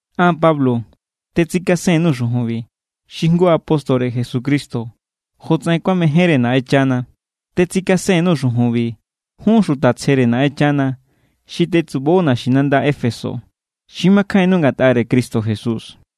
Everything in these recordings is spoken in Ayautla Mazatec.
An, Pablo, tetsikasen_nuu̱ xujunbi, xi jngu apóstore Jesucristo jotsaꞌen kuamejénre Naꞌenchana. Tetsikasen_nuu̱ xujunbi jun xuta tsjere Naꞌenchana xi tetsubo naxinanda Éfeso, xi makjainnu ngatꞌare Cristo Jesús.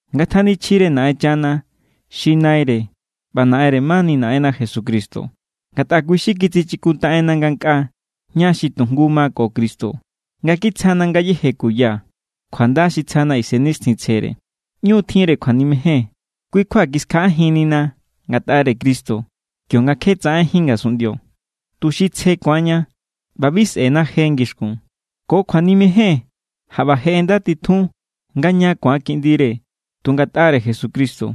Ngatjanichjire Naꞌenchana xi Naire ꞌba Naꞌenre mani Naꞌenna Jesucristo. Ngatꞌa kui xi kitsichikuntaꞌenna ngankꞌaa ña xi tu jngu ma ko Cristo nga kitsjana ngayéje kuya kjuanda xi tsjana Isennixtjintsjere. ꞌÑu= tjinre kjuanimejen. Kui kjua kiskjaꞌajinnina ngatꞌare Cristo kionga kje tsaꞌenjín ngasunꞌndio, tuxi tsje ku̱anña ꞌba bi sꞌe̱na je ngixkun. Ko kjuanimejen jaꞌba je ꞌendatitjun nga ña ku̱an kiꞌndire tu ngatꞌare Jesucristo,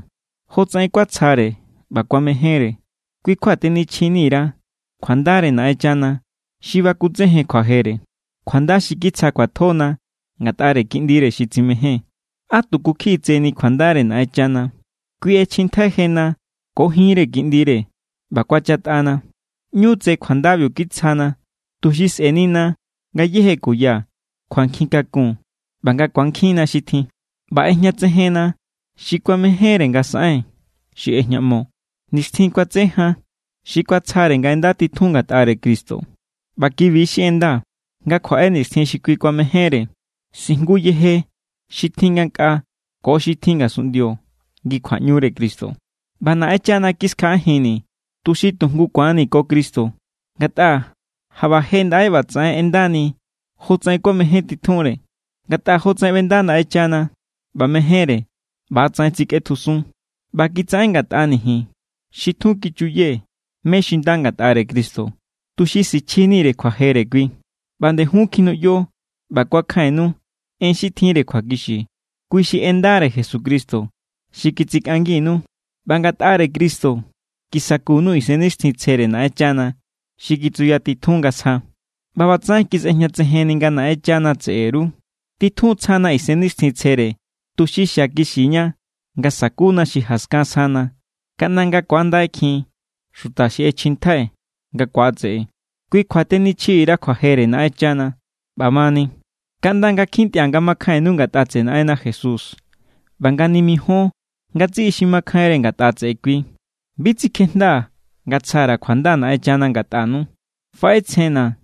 jotsaꞌen kuatsjare ꞌba kuamejénre. Kui= kjua tenichjini_ra kjuandare Naꞌenchana xi bakutsejen kjuajere, kjuanda xi kitsja kjuatjona ngatꞌare Kiꞌndire xi tsimején. ¡Á tuku kjiꞌi tseni kjuandare Naꞌenchana! Kui ꞌechjintjai jena ko jinre Kiꞌndire ꞌba kuachatꞌana. ꞌÑu tse kjuandabiu kitsjana, tuxi sꞌe̱nina ngayéje kuya kjuankjin kakun ꞌba nga ku̱ankjinna xi tjin. ꞌBa ꞌejñatsejenna xi kuamejénre nga saꞌen, xi ꞌejñaꞌmo nixtjin kuatse jan, xi kuatsjare nga ꞌendatitjun ngatꞌare Cristo. ꞌBa ki=bi xi ꞌenda: Nga kjuaꞌe nixtjin xi kui mejénre, sijnguje yeje xi tjin ngankꞌaa ko xi tjin ngasunꞌndio ngi kjuaꞌñure Cristo. ꞌBa Naꞌenchana kiskjaꞌajinni̱, tuxi tu jngu ku̱annii̱ ko Cristo ngatꞌa jaꞌba je ndaꞌe ꞌbatsaꞌen ꞌendani̱ jotsaꞌen kuamejéntitjunre. Ngatꞌa jotsaꞌen ꞌbenda Naꞌenchana ꞌba mejénre, ꞌba=tsaꞌen tsikꞌetjusun. ꞌBa kitsaꞌen ngatꞌani̱ ji̱n xi tjun kichuyee̱ mé= xi nda ngatꞌare Cristo, tuxi sichjinire kjuajere kui. ꞌBa nde jun kjinuꞌyo ꞌba kuakjainnu en xi tjinre kjuakixi. Kui xi en ndare Jesucristo xi kitsikꞌanginu. ꞌBa ngatꞌare Cristo kisakunu Isennixtjintsjere Naꞌenchana xi kitsuyatitjun nga sja. ꞌBa ꞌbatsaꞌen kisꞌejñatsejenni nga Naꞌenchana tseꞌe_ru. Titjun= tsjana Isennixtjintsjere, tuxi xiakixiña nga sakuna xi jaskan sjana, kaꞌnda nga ku̱andaikjin xuta xi ꞌechjintjai̱ nga ku̱atseꞌe. Kui kjua tenichjini_ra kjuajere Naꞌenchana. ꞌBamani, kaꞌnda nga kjintꞌia̱ nga makjainnu ngatꞌa tseꞌe Naꞌenna Jesús ꞌba nga nimijíon ngatsiꞌi xi makjainre ngatꞌa tseꞌe kui, bi tsikjejndaa̱ nga tsja_ra̱ kjuanda Naꞌenchana ngatꞌanu. Faꞌetsjenna̱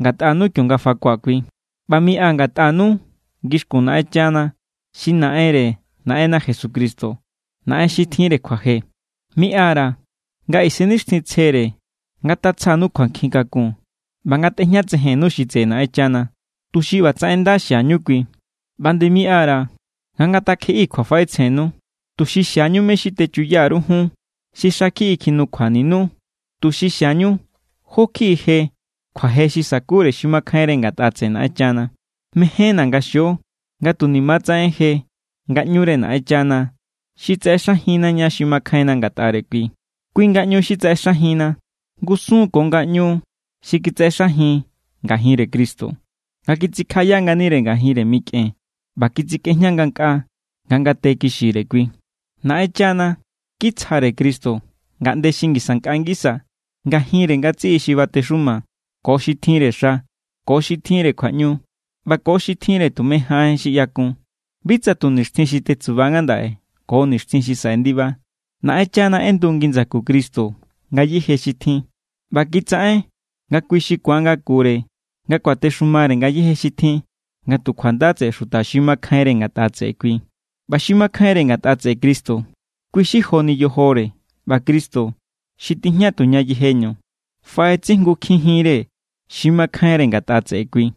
ngatꞌanu kionga fakua̱ Kui. ꞌBa miꞌa ngatꞌanu ngixkun Naꞌenchana xi Naꞌenre Naꞌenna Jesucristo, Naꞌen xi tjinre kjuaje. Miꞌa_ra̱ nga Isennixtjintsjere ngatatsjanu kjuankjin kakun ꞌba ngatꞌejñatsejennu xi tseꞌe Naꞌenchana, tuxi ꞌbatsaꞌen nda xiañu Kui. ꞌBa nde miꞌa_ra̱ nga ngatakjeꞌii̱ kjuafaꞌetsjennu, tuxi xiañu mé= xi techuya_ru jun xi xa kjiꞌi kjinukjuaninu, tuxi xiañu jó kjiꞌi je kjuaje xi sa̱kure xi makjainre ngatꞌa tseꞌe Naꞌenchana. Mejénna̱ nga xio nga tunima= tsaꞌen je ngaꞌñure Naꞌenchana xi tsaꞌexajinna ña xi makjainna ngatꞌare kui, kui ngaꞌñu xi tsaꞌexajinna ngusun= ko ngaꞌñu xi kitsaꞌexajin ngajinre Cristo, nga kitsikjaꞌaya nganire ngajinre mikꞌen ꞌba kitsikꞌejña ngankꞌaa nga ngate kixire kui. Naꞌenchana kitsjare Cristo ngaꞌnde xi ngisa nkꞌa ngisa ngajinre ngatsiꞌi xi batexuma, ko xi tjinre xa, ko xi tjinre kjuaꞌñu, ꞌba ko xi tjinre tume jaꞌen xi ꞌyakun, bi tsa tu nixtjin xi tetsuba ngandaꞌe, ko nixtjin xi saꞌe ndiba. Naꞌenchana ꞌendu ngi ndsaku Cristo ngayéje xi tjin, ꞌba kitsaꞌen nga kui xi ku̱an ngakure nga kuatexumare ngayéje xi tjin nga tu kjuanda tseꞌe xuta xi makjainre ngatꞌa tseꞌe kui. ꞌBa xi makjainre ngatꞌa tseꞌe Cristo, kui= xi joni yojore. ꞌBa Cristo, xi tijña tuña yejeñu, faꞌetsijngukjinjinre xi makjainre ngatꞌa tseꞌe kui.